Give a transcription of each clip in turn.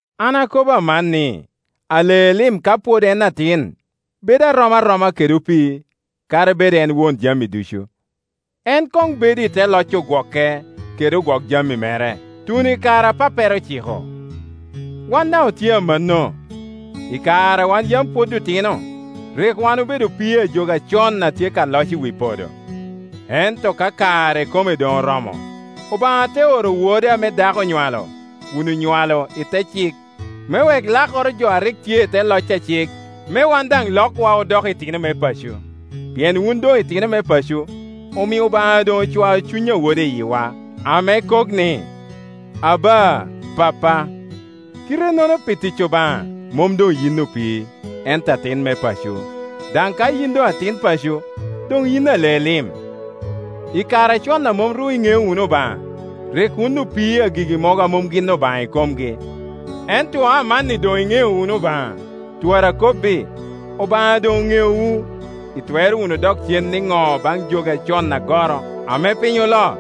An akobo aman ni, ale lim ka pwod en atin bedo rom aroma kede opii, kadi bed en won jami ducu. En koŋ bedo i te loc ogwoke kede ogwok jami mere, tuno i kare a pappere ociko. Wan daŋ otye amanno; i kare a wan yam pwod otino, rik wan obedo opii a jogi acon a tye ka loc i wi podo. Ento ka kare ikome doŋ oromo, Obaŋa te oro Wode ame dako onywalo, kun onywalo i te cik, me wek lakoro jo a rik tye i te loc a cik, me wan daŋ lokwa odok itino me paco. Pien wun doŋ itino me paco, omio Obaŋa doŋ ocwao Cuny a Wode i yiwa, ame kok ni, “Aba! Pappa!” Kite-nono pi tic Obaŋa mom doŋ yin opii, ento atin me paco; daŋ ka yin doŋ atin paco, doŋ yin ale lim. I kare acon a mom ru iŋeo wunu Obaŋa, rik wun opii a gigi mogo a mom gin obaŋa ikomgi. Ento amanni doŋ iŋeo wunu Obaŋa, twara akobbi, Obaŋa doŋ neowu; itwero wunu dok cen niŋo baŋ jogi acon agoro, ame piny oloo?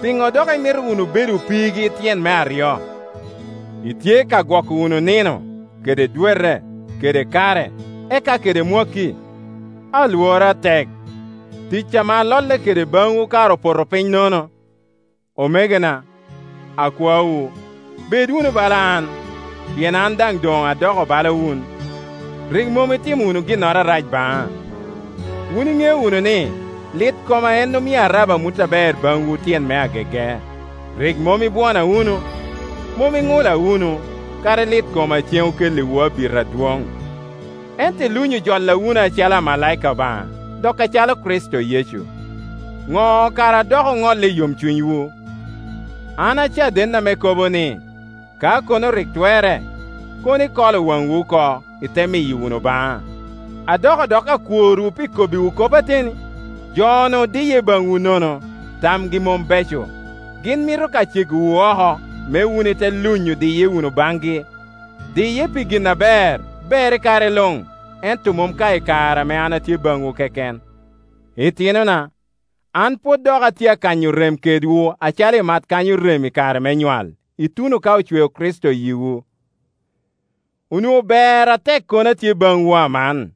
Piŋo dok imito wunu bedo opiigi tyen me aryo? Itye ka gwoko wunu nino, kede dwete, kede kare, eka kede mwakki! Alworo atek, ticca ame alolle kede baŋwu kara opoto piny nono. Omegona, akwaowu, bed wunu bala an, pien an daŋ doŋ adoko bala wun. Rik mom itimo wunu ginnoro arac baŋa. Wun iŋeo wunu ni, lit koma en omio arabo amut aber baŋwu tyen me agege. Rik mom ibwona wunu, mom iŋula wunu, kadi lit koma ceŋ okelliwu abita adwoŋ; ento iluŋyo jola wunu acalo amalaika Obaŋa, dok acalo Kricito Yecu. Ŋo kara a dok oŋolle i yomcunywu? An acaden ame kobo ni, Ka kono rik twerre, kono ikolo waŋwu oko, ite miyo wunu baŋa. Adoko dok akworwu pi kobbiwu kop ateni? Jo-nu diye baŋwu nono, tamgi mom beco. Gin mito ka cegowu oko, me wun ite luŋyo diye wunu baŋgi. Diye pi gin aber, ber i kare luŋ, ento mom ka i kare ame an atye baŋwu keken. Itinona, an pwod dok atye akanyo rem kedwu acalo imat kanyo rem i kare me nywal, ituno ka ocweo Kricito i yiwu. Onwoŋo ber atek kono atye baŋwu aman,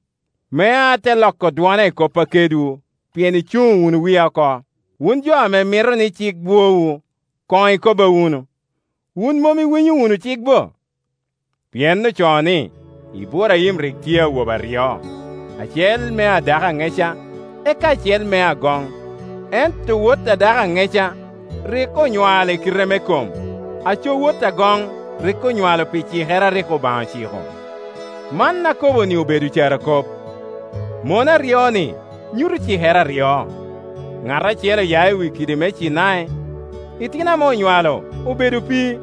me ate loko dwona i koppa kedwu, pien icuŋo wunu wia oko. Wun jo ame mito ni cik bwowu, koŋ ikobba wunu. Wun mom iwinyo wunu cik bo? Pien ocoo ni, Iburaim rik tye awobe aryo, acel mea dako aŋeca, eka acel mea agoŋ. Ento wot a dako aŋeca rik onywalo i kite me kom, aco wot agoŋ rik onywalo pi cikere a rik Obaŋa ociko. Man akobo-ni obedo carokop. Mon aryo-ni nyuto cikere aryo. Ŋat acel oya i wi kidi me Cinai, itino ame onywalo obedo opii;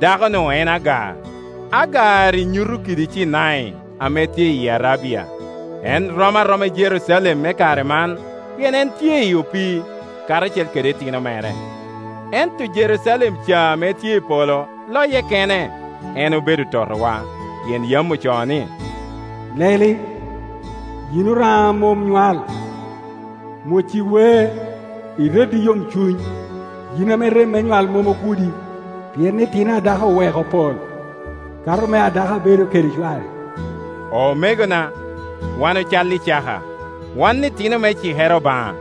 dako-nu en Agar. Agar-ri nyuto kidi Cinai, ame tye iyi Arabia; en rom aroma i Jerucalem me kare man, pien en tye i opii, karacel kede itino mere. Ento Jerucalem ca ame tye i polo loye kene, en obedo totowa. Pien yam ocoo ni, “Leli, yin oraŋa a mom nywal; mwoc i wer, ired i yomcuny, yin ame rem nywal mom ogudi; pien itino a dako oweko pol, kato mea dako a bedo kede cware.” Omegona, wan ocalli Icaka, wan itino me cikere Obaŋa.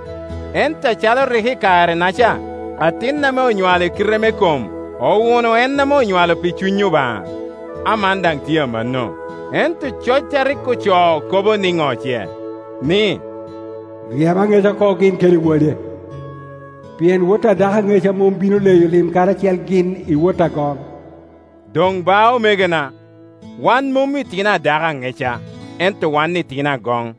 Ento acalo rik i kare-naca atin ame onywalo i kite me kom owuno en ame onywalo pi Cuny Obaŋa, aman daŋ tye amanno. Ento coc a rik ocoo kobo niŋo ce? Ni, “Ryem aŋeca oko gin kede wode, pien wot a dako aŋeca mom bino leyo lim karacel gin i wot agoŋ.” Doŋ ba, omegona, wan mom itino a dako aŋeca, ento wan itino agoŋ.